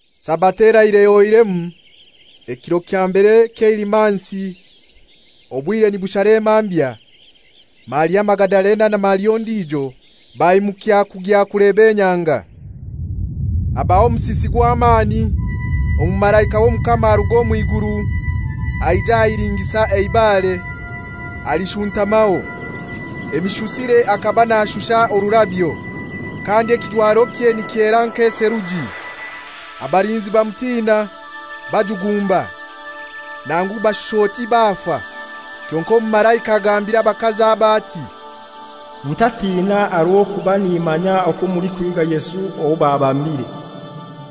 Sabato eraire ehoiremu, ekiro kya mbere ky'eilimansi obwire nibushara emambya, Maria Magadalena na Maria ondijo baimukya kugya kuleba enyanga. Habaho omusisi gw'amani; omumalaika w'Omukama aruga omu iguru aija ahilingisa eibare, alishuntamaho. Emishusire akaba nashusha orurabyo, kandi ekijwarokye nikyera nk'eseruji. Abalinzi bamutina, bajugumba, nangu bashusha oti bafa. Kyonkai omumalaika agambira abakazi abo ati, «Mutatina aha rw'okuba nimanya okwo mulikuhiiga Yesu owo babambire.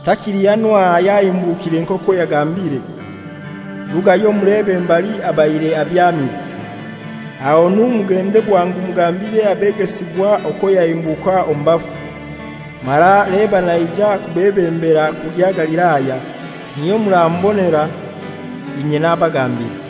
Takili hanu aha yahimbukire nk'okwo yagambire. Rugayo mulebe mbali abaire abyamire. Ahonu mugende bwangu mugambire abegesibwa okwo yahimbuka omu bafu, mara leba naija kubebembera kugya Galilaya, niyo muramubonera, inye nabagambira.»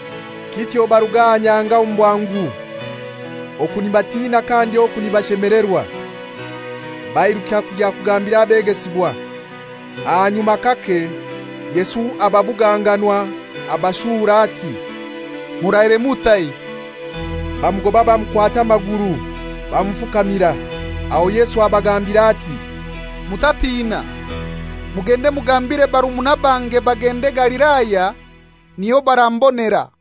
Kityo baruga aha nyanga omu bwangu, oku nibatina kandi oku nibashemelerwa, bairuka kugya kugambira abegesibwa. Ahanyuma kake Yesu ababuganganwa, abashuura ati, «Muraire mutai!» Bamugoba bamukwata amaguru bamufukamira. Aho Yesu abagambira ati, «Mutatina. Mugende mugambire barumuna bange bagende Galilaya, niyo barambonera.»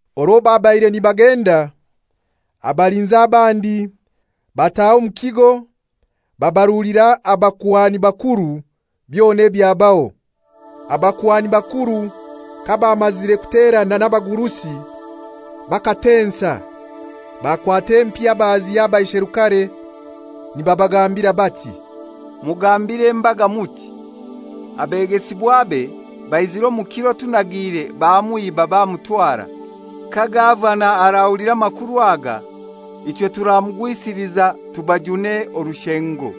Orwo babaire nibagenda, abalinzi abandi bataha omu kigo babarulira abakuhani bakuru byona ebyabaho. Abakuhani bakuru kabamazire kuterana n'abagurusi bakatensa, bakwata empiha baziha abaisherukare nibabagambira bati, «Mugambire embaga muti, ‹Abegesibwabe baizire omu kiro tunagiire bamwiba bamutwara.› Ka gavana arahulira amakuru aga ichwe turamugwisiliza tubajune orushengo.»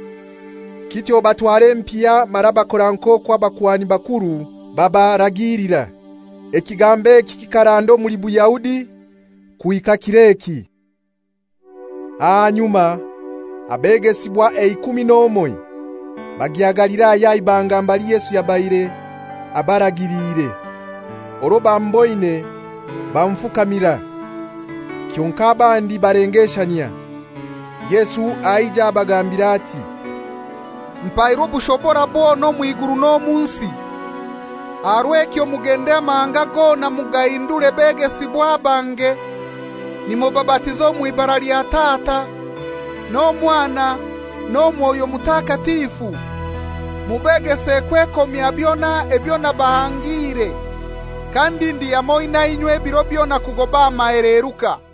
Kityo batwara empiha mara bakora nk'okwo abakuhani bakuru babaragilira. Ekigambo eki kikaranda omuli Bayahudi kuhika kir'eki. Ahanyuma abegesibwa eikumi n'omoi bagya Galilaya aha ibanga mbali Yesu yabaire abaragiliire. Orwo bamuboine bamufukamira. Kyonkai abandi balengeshanyia. Yesu aija abagambira ati, «Mpairwe obushobora bwona omw'iguru n'omu nsi. Aha rw'ekyo mugende amahanga gona mugahindure begesibwa bange, nimubabatiza omw'ibara lya Tata n'Omwana n'Omwoyo Mutakatifu. Mubegese kwekomya byona ebyo nabahangiire. Kandi ndi hamoi na inywe ebiro byona kugoba aha maheleruka.»